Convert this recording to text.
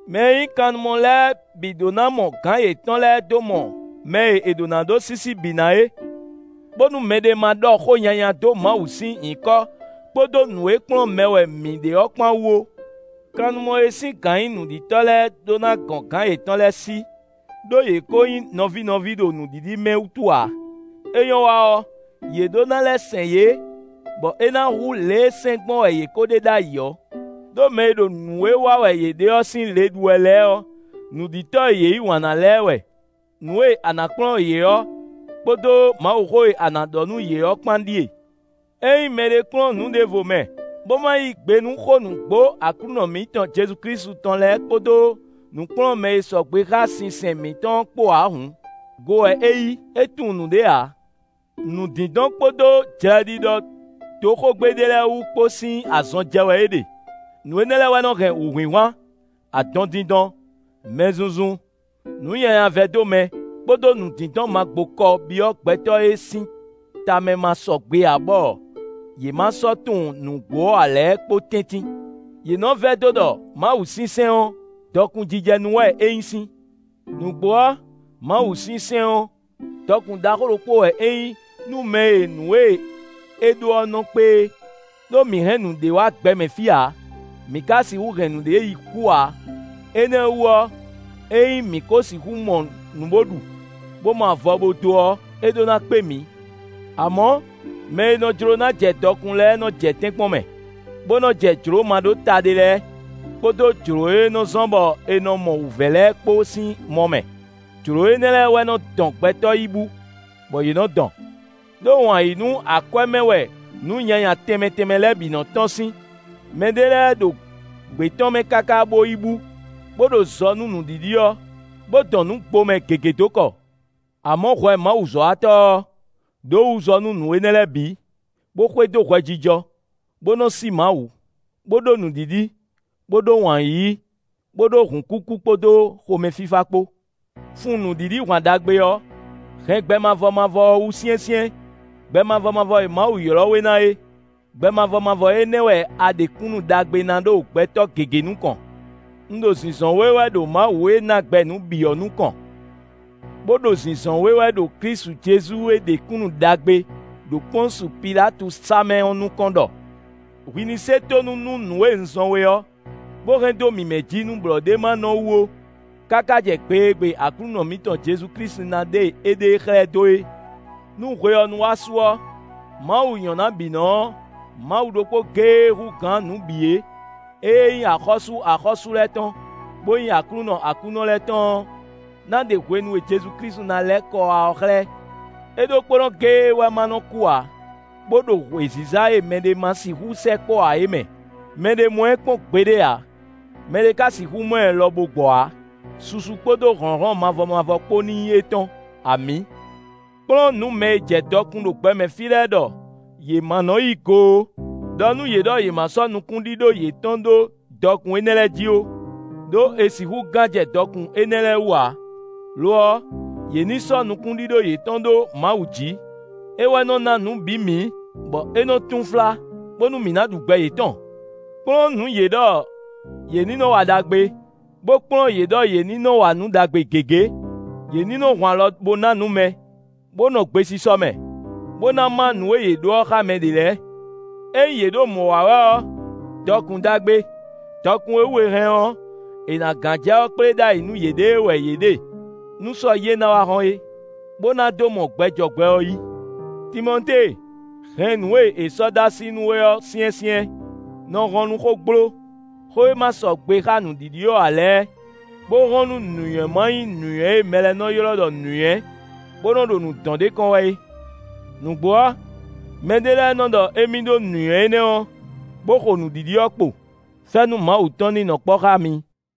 Mɛ e nyí kannumɔ lɛ́ɛ bǐ ɖó ná mɔ gǎn yětɔn lɛ́ɛ dó mɔ mɛ e è ɖó ná ɖó sísí bǐ ná é, bónú mɛɖé ma ɖɔ xó nyanya dó Mawu sín nyǐkɔ kpódó nǔ e kplɔ́n mɛ wɛ mǐ ɖe ɔ́ kpán wú ó. Kannumɔ e sín gǎn nyí nǔɖitɔ́ lɛ́ɛ ɖó ná gɔn gǎn yětɔn lɛ́ɛ sí, ɖó yě ko nyí nɔví nɔví ɖo nǔɖiɖi mɛ wútu ǎ; é nyɔ́ wa ɔ́, yě ɖó ná lɛ́ sɛn yě bɔ é ná hú lě e sɛn gbɔn wɛ yě ko ɖe ɖ'ayǐ ɔ́, ɖó mɛ e ɖo nǔ e wa wɛ yě ɖe ɔ́ sín le ɖu wɛ lɛ́ɛ ɔ́, nǔɖitɔ́ e yě yí wǎn ná lɛ́ɛ wɛ. Nǔkplɔ́nmɛ e ma sɔgbe xá Mawuxó ǎ lɛ́ɛ kpódó dɔkun jɔ dɔkun lɛ́ɛ kpó. Nǔ e a ná kplɔ́n yě ɔ́ kpódó Mawuxó e a ná ɖɔ nú yě ɔ́ kpán ɖíe: Ényí mɛɖé kplɔ́n nǔ ɖěvo mɛ, bó ma yí gbe nú xó nǔgbó Aklúnɔ mǐtɔn Jezu Klísu tɔn lɛ́ɛ kpódó nǔkplɔ́nmɛ e sɔgbe xá sinsɛn mǐtɔn ɔ́ kpó ǎ hǔn, go wɛ é yí; é tunwun nǔɖé ǎ; nǔdindɔn kpódó jlɛɖiɖɔ dó xógbe ɖé lɛ́ɛ wú kpó sín azɔn jɛ wɛ é ɖe; nǔ énɛ́ lɛ́ɛ wɛ nɔ hɛn wǔhwinhwan, adɔndindɔn, mɛzunzun, nǔnyanyavɛdómɛ, kpódó nǔdindɔn magbokɔ byɔ́ gbɛtɔ́ e sín tamɛ ma sɔgbe ǎ bɔ yě ma sɔ́ tunwun nǔgbó ɔ́ ǎ lɛ́ɛ kpó tɛ́ntin; yě nɔ vɛdó ɖɔ mawusinsɛn ɔ́, dɔkun jijɛ nú wɛ é nyí sín. Nǔgbó ɔ́, mawusinsɛn ɔ́, dɔkun ɖaxó ɖokpó wɛ é nyí nú mɛ e nǔ e é ɖó ɔ́ nɔ kpé é. Đó mǐ hɛn nǔɖé wá gbɛmɛ fí ǎ; mǐ ka sixú hɛn nǔɖé yi kú ǎ. Énɛ́ ɔ́ wú ɔ́, ényí mǐ kó sixú mɔ nǔ bó ɖu, bó mɔ avɔ bo dó ɔ́, é ɖó ná kpé mǐ. Amɔ̌, mɛ e nɔ jló ná jɛ dɔkun lɛ́ɛ nɔ jɛ tɛ́nkpɔ́n mɛ, bó nɔ jɛ jlǒ ma ɖó ta ɖé lɛ́ɛ, kpódó jlǒ e nɔ zɔ́n bɔ è nɔ mɔ wǔvɛ́ lɛ́ɛ kpó sín mɔ mɛ; jlǒ énɛ́ lɛ́ɛ wɛ nɔ dɔn gbɛtɔ́ yi bú, bɔ yě nɔ dɔn. Đó wǎn yí nú akwɛ́ mɛ wɛ nǔ nyanya tɛnmɛ tɛnmɛ lɛ́ɛ bǐ nɔ tɔ́n sín; mɛɖé lɛ́ɛ ɖo gbě tɔn mɛ káká bó yi bú, bó ɖo zɔ nú nǔɖiɖi ɔ́, bó dɔn nǔgbomɛ gěgé dó kɔ. Amɔ̌ hwɛ mawuzɔ́watɔ́ ɔ́, ɖǒ wǔ zɔ nú nǔ énɛ́ lɛ́ɛ bǐ, bó xwedó hwɛjijɔ, bó nɔ sí Mawu, bó ɖó nǔɖiɖi, bó ɖó wǎn yíyí, bó ɖó hǔnkúkú kpódó xomɛfífá kpó. Fun nǔɖiɖi hwan ɖagbe ɔ́. Hɛn gbɛ mavɔ mavɔ ɔ́ wú syɛ́nsyɛ́n, gbɛ mavɔ mavɔ e Mawu ylɔ́ we ná é. Gbɛ mavɔ mavɔ énɛ́ wɛ a ɖe kúnnu ɖagbe ná ɖo gbɛtɔ́ gěgé nukɔn. Un ɖo zinzɔn we wɛ ɖo Mawu e ná gbɛ nǔ bǐ ɔ́ nukɔn, bó ɖo zinzɔn we wɛ ɖo Klísu Jezu e ɖe kúnnu ɖagbe ɖo Pɔ́nsu Pilátu sá mɛ ɔ́ nukɔn ɖɔ hwi ní se tónú nú nǔ e un zɔ́n we ɔ́, bó hɛn dó mǐmɛ́ jí nú blɔ̌ ɖé ma nɔ wú ó, káká jɛ gbe e gbe Aklúnɔ mǐtɔn Jezu Klísu ná ɖe éɖée xlɛ́ dó é. Nú hwe ɔ́ nu wá su ɔ́, Mawu nyɔ̌nábǐnɔ ɔ́, Mawu ɖokpó géé e hú gǎn nǔ bǐ é, ée nyí Axɔ́sú axɔ́sú lɛ́ɛ tɔn, bó nyí Aklúnɔ aklúnɔ lɛ́ɛ tɔn ɔ́, ná ɖe hwenu e Jezu Klísu na lɛ́ kɔ wá ɔ́ xlɛ́. É ɖokpónɔ géé wɛ má nɔ kú ǎ, bó ɖo wěziza e mɛɖé ma sixú sɛkpɔ́ ǎ é mɛ; mɛɖé mɔ ɛ kpɔ́n gbeɖé ǎ; mɛɖé ka sixú mɔ ɛ lɔ bo gbɔ ǎ. Susu kpódó hlɔ̌nhlɔ́n mavɔ mavɔ kpó ní nyí étɔn; amǐ! Kplɔ́n nǔ mɛ e jɛ dɔkun ɖo gbɛmɛ fí lɛ́ɛ ɖɔ yě ma nɔ yí go ó; ɖɔ nú yě ɖɔ yě ma sɔ́ nukúnɖíɖó yětɔn ɖó dɔkun énɛ́ lɛ́ɛ jí ó; ɖó è sixú gán jɛ dɔkun énɛ́ lɛ́ɛ wú ǎ. Lo ɔ́, yě ní sɔ́ nukúnɖíɖó yětɔn ɖó Mawu jí; é wɛ nɔ ná nǔ bǐ mǐ, bɔ é nɔ túnflá, bónú mǐ ná ɖu gbɛ yětɔn. Kplɔ́n nǔ yě ɖɔ yě ní nɔ wa ɖagbe, bó kplɔ́n yě ɖɔ yě ní nɔ wa nǔ ɖagbe gěgé. Yě ní nɔ hun alɔ bó ná nǔ mɛ, bó nɔ gbesisɔ mɛ, bó ná má nǔ e yě ɖó ɔ́ xá mɛ ɖě lɛ́ɛ. Ényí yě ɖo mɔ̌ wa wɛ ɔ́, dɔkun ɖagbe, dɔkun e wú è hɛn ɔ́, è nǎ gán jɛ ɔ́ kplé ɖ'ayǐ nú yěɖée wɛ yě ɖe nú sɔ yí e ná wá hɔ́n é, bó ná dó mɔ gbɛ jɔ gbɛ ɔ́ yí. Timɔtée, hɛn nǔ e è sɔ́ dó así nú we ɔ́ syɛ́nsyɛ́n. Nɔ hɔn nú xógbló, xó e ma sɔgbe xá nǔɖiɖi ɔ́ ǎ lɛ́ɛ, bó hɔn nú nǔnywɛ́ ma nyí nǔnywɛ́ e mɛ lɛ́ɛ nɔ ylɔ́ ɖɔ nǔnywɛ́, bó nɔ ɖo nǔ dɔn ɖ'é kɔn wɛ é. Nǔgbó ɔ́, mɛɖé lɛ́ɛ nɔ ɖɔ émí ɖó nǔnywɛ́ énɛ́ ɔ́, bó xo nǔɖiɖi ɔ́ kpo. Fɛ́nú Mawu tɔn ní nɔ kpɔ́ xá mi.